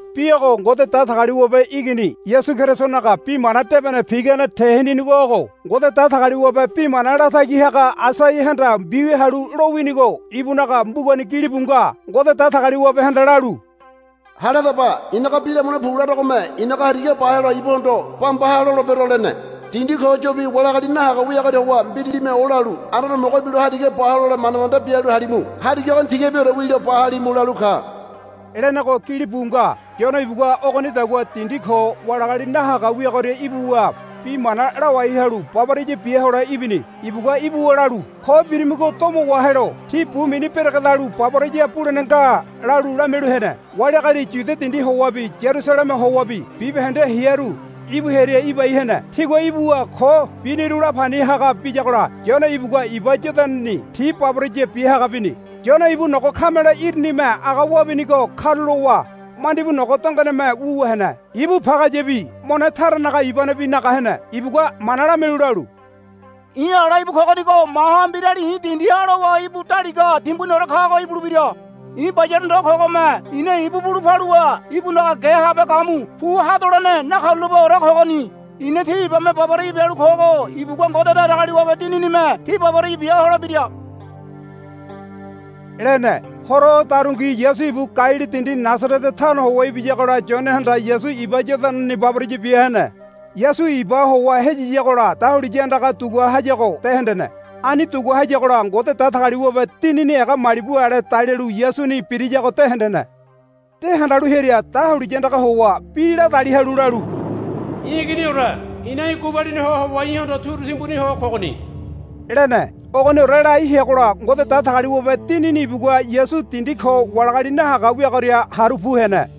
Bi ogo Ngode Datagaliwabe Igini Yasu Kerisonaga Bi Mana Debene pigane teninigo ogo. Ngode Datagaliwabe bi mana latagi haga Aisaiahanda mbiwia halu lowinigo ibunaga mbugani gilibu nga. Ngode Datagaliwabehanda lalu, Hale hadaba. I̱naga bi lamule pu larogome í̠naga hariga ba helo ibuhondo, Bamba ha, lolebero, lene. Dindi ko yobi wali agali nahaga wiagoria howa mbiralime olalu, Anduane Homogo ibilo hariga ba hole manda manda bialu halimu. Hariga ogoni tigabiore wilo ba halimu, lalu ka, lenego gilibu nga. Yone ibugua ogonidagua dindi ko wali agali nahaga wiagoria ibuwa bi mana lawai halu baboraya bia hole ibini. Ibugua ibuwa lalu, Ko birimigo domo wahelo tí bu mini beregedalu baboraya bulene nga, lalu lamialu hene. Wali agali Yudia dindi howabi Yarusaleme howabi bibahende hearu ibu hearia ibai hene. Tigua ibuwa ko biniru la pani haga biyagola Yone ibugua iba Yodanani ti baboraya biahaga bini. Yone ibu nogo kamele irinime aga wabinigo karulowa mandibu nogo dongoneme wuwa hene. Ibu pagayabi mone taranaga ibanebi naga hene. Ibugua mana lamialu lalu, I̱ ala íbu kogonigo maha mbirali i̱ dindiha lowa ibu daliga timbuniore kago ibulebira. I̱ bayale ndo kogome i̱na bulu paluwa ibunaga ge habe gamu pu hadolene nakarulapeore kogoni. I̱na tí ibame baboraya bialu kogo ibugua Ngode Datagaliwabe Dininime tí baboraya bia holebira, lene. Horo odarungi Yasu ibu Galili dindi Nasarete tano howa ibiyagola Yonehanda Yasu iba Yodanani baboraya bia hene. Yasu ibaha howa hayayigola dahuliya andaga dugua hayago de hendene. Ani dugua hayagola Ngode Datagaliwabe Dinini ega malibu ale dalialu Yasuni birayago de hendene. De handalu hearia dahuliya andaga howa bi ladali halu lalu, I̱ Iginiore i̱na í̠ gubalini ho howa í̠hondo turu timbuni ho kogoni, lene. Ogoniore lai heagola Ngode Datagaliwabe Dinini ibugua Yasu dindi ko wali agali nahaga wiagoria haru pu hene.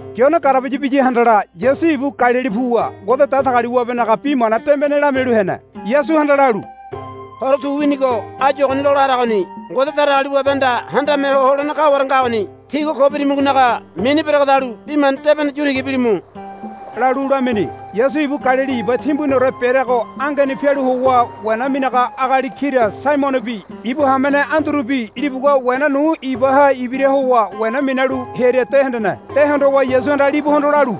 Yone garabaya biya handala Yasu ibu Galili puwa Ngode Datagaliwabenaga Bi Mana Debene lamialu hene. Yasuhanda lalu, Horo tu winigo áyu ogoni lola haragoni. Ngode Datagaliwabehanda Handame Ho Holene kaware ngagoni. Tígua ko birimigonaga mini beregedalu Bi Mana Debene yu tiga bilimu, lalu lamini. Yasu ibu Galili iba timbuniore bereago angeni pialu howa wena minaga agali kira Saimonobi ibu hamene Andurubi libugua wena nu ibaha ibira howa wena minalu hearia de hendene. De hondowa Yasuhanda libuhondo lalu,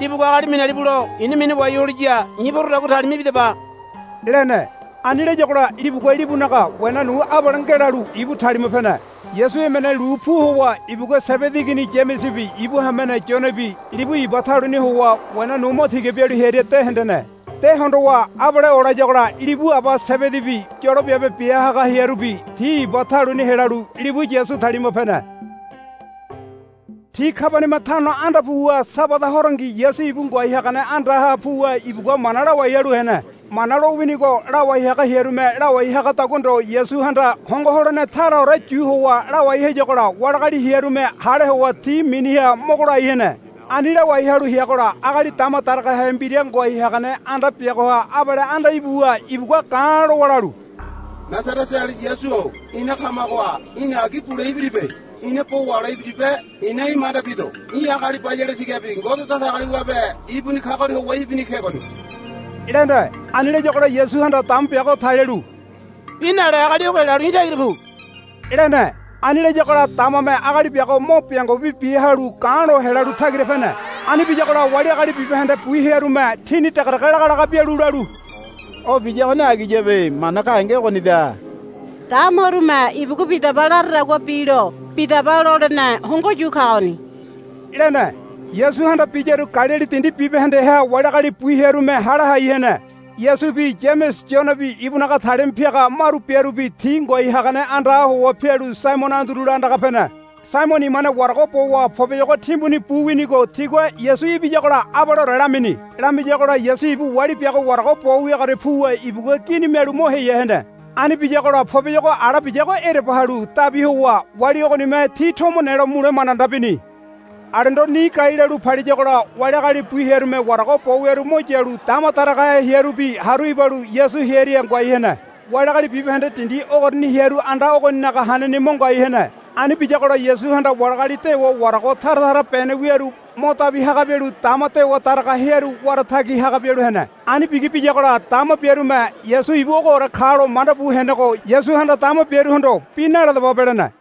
Libugua agali minalibulo i̱na minawai holiya i̱ porodagua talima ibidaba, lene. Ani layagola libugua libunaga wena nu abale ngelalu ibu talima pene. Yasu emene lu pu howa ibugua Sebedi igini Yamesebi ibu hamene Yonebi libu iba taluni howa wena nu mo tiga bialu hearia de hendene. De hondowa abale olayagola libu aba Sebedibi yolo biabe biaga hearubi ti iba taluni helalu libu Yasu talima pene. Ti Kabaniama tano anda puwa Sabada horongi Yasu ibu ngoai hagane andaha puwa ibugua mana lawai halu hene. Mana lowinigo lawai haga hearume lawai hagadagua ndo Yasuhanda hongo holene taraore yu howa lawai hayagola wali agali hearume hale howa ti miniha mogo lai hene. Ani lawai halu heagola agali dama daragahe mbira ngoai hagane anda biagoha abale anda ibuwa ibugua ga̱ lowa lalu, Nasaretaeali Yasu-o ina kamagoha í̠na agi bule ibiribe. Ina bo wahole ibiribe. I̱na í̠ manda bido í̠ agali bayale tigabi Ngode Datagaliwabe ibuni kagoria howa ibini kegoni, lene. Ani layagola Yasuhanda dama biago talialu, Bi nale agali ogo helalu í̠ tagira pu, lene. Ani layagola damame agali biago mo biango bibi bia halu ga̱ lo helalu tagira pene. Ani biyagola wali agali bibahende bu hearume tini degedege lagalaga bialu lalu, O biyagoni agiyabe. Mana gahenge ogonida. Damarume ibugua bidaba laradagua bilo bidaba lolene hongo yu kagoni, lene. Yasuhanda biyaru Galili dindi bibahendeha wali agali bu hearume hale hai hene. Yasubi Yamese Yonebi ibunaga talima piaga maru biarubi ti ngoai hagane andaha howa pialu Saimono Andurula andaga pene. Saimono imane warago bowa poboyogo timbuni bu winigo tigua Yasu ibiyagola abaleore lamini. Lamiyagola Yasu ibu wali biago warago bo wiagoria puwa ibugua gini mialu mo heya hene. Ani biyagola poboyogo ala biyago ereba halu dabi howa wali ogonime ti tomo nelo mule manda manda bini. Alendo ni gai lalu paliyagola wali agali bu hearume warago bo wiaru mo yalu dama daragahe hearubi haru ibalu Yasu hearia ngoai hene. Wali agali bibahende dindi ogoriani hearu anda ogoninaga haneni mo ngoai hene. Ani biyagola Yasuhanda wali agali dewa warago tara tara bene wiaru mo dabi haga bialu dama dewa daraga hearu wara tagi haga bialu hene. Ani bigi biyagola dama biarume Yasu ibu ogoore kalo manda bu henego Yasuhanda dama biaruhondo, Bi naladababe, lene.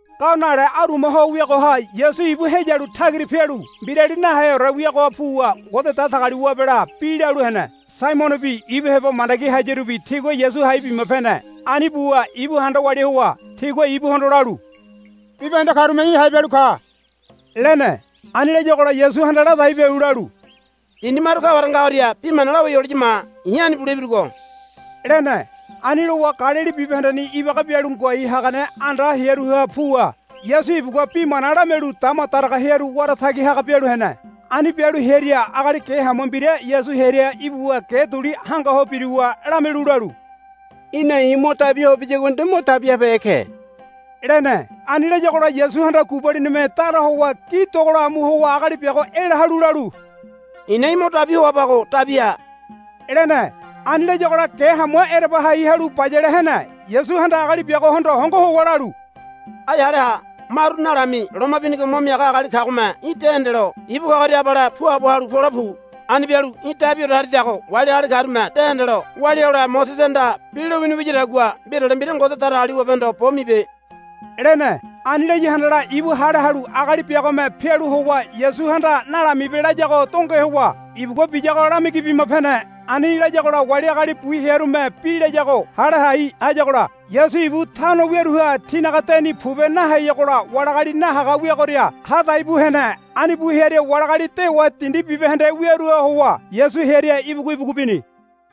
Gao nale aruma ho wiagoha Yasu ibu heyalu tagira pialu mbirali naheore wiagoha puwa Ngode Datagaliwabela bi lalu hene. Saimonobi ibu heba mandagi hayarubi tigua Yasu hai bima pene. Ani buwa ibu handa walia howa tigua ibuhondo lalu, Bibahende karume í̠ hai bialu ka, lene. Ani layagola Yasuhanda ladai bialu lalu, Dindi maru kaware ngagoria bi mana lawai holiya ma. I̱ ani bule ibirugo, lene. Ani lowa Galili bibahendeni ibaga bialu ngoai hagane anda hearuha puwa Yasu ibugua bi mana lamialu dama daraga hearu wara tagi haga bialu hene. Ani bialu hearia agali ge hamua mbira Yasu hearia ibuwa ge duli hanga ho biruwa lamialu lalu, Í̠na i̱ mo dabi hoa biyagua nde mo dabi habehe ke, lene. Ani layagola Yasuhanda gubalinime dara howa gi dogola amu howa agali biago ela halu lalu, I̱na í̠ mo dabi hoabago dabi ha, lene. Ani layagola ge hamua ereba hai halu bayale hene. Yasuhanda agali biagohondo hongo howa lalu, Ai hale ha. Maru nalami loma binigo mo miaga agali kagome í̠ de hendelo ibu kagoria abale puabo halu pole pu. Ani bialu í̠ dabiore haridago wali agali karume de hendelo walia hole Mosesehanda bi lowini wiyadagua mbirale mbira Ngode Datagaliwabehondo bo mibe, lene. Ani laya handala ibu hale halu agali biagome pialu howa Yasuhanda nalamibe layago donge howa ibugua biyago lamigi bima pene. Ani layagola wali agali bu hearume bi layago hale hai hayagola Yasu ibu tano wiaruha tinaga deni pobe naheyagola wali agali nahaga wiagoria ha dai bu hene. Ani pu hearia wali agali dewa dindi bibahende wiaruha howa Yasu hearia ibugu ibugu bini.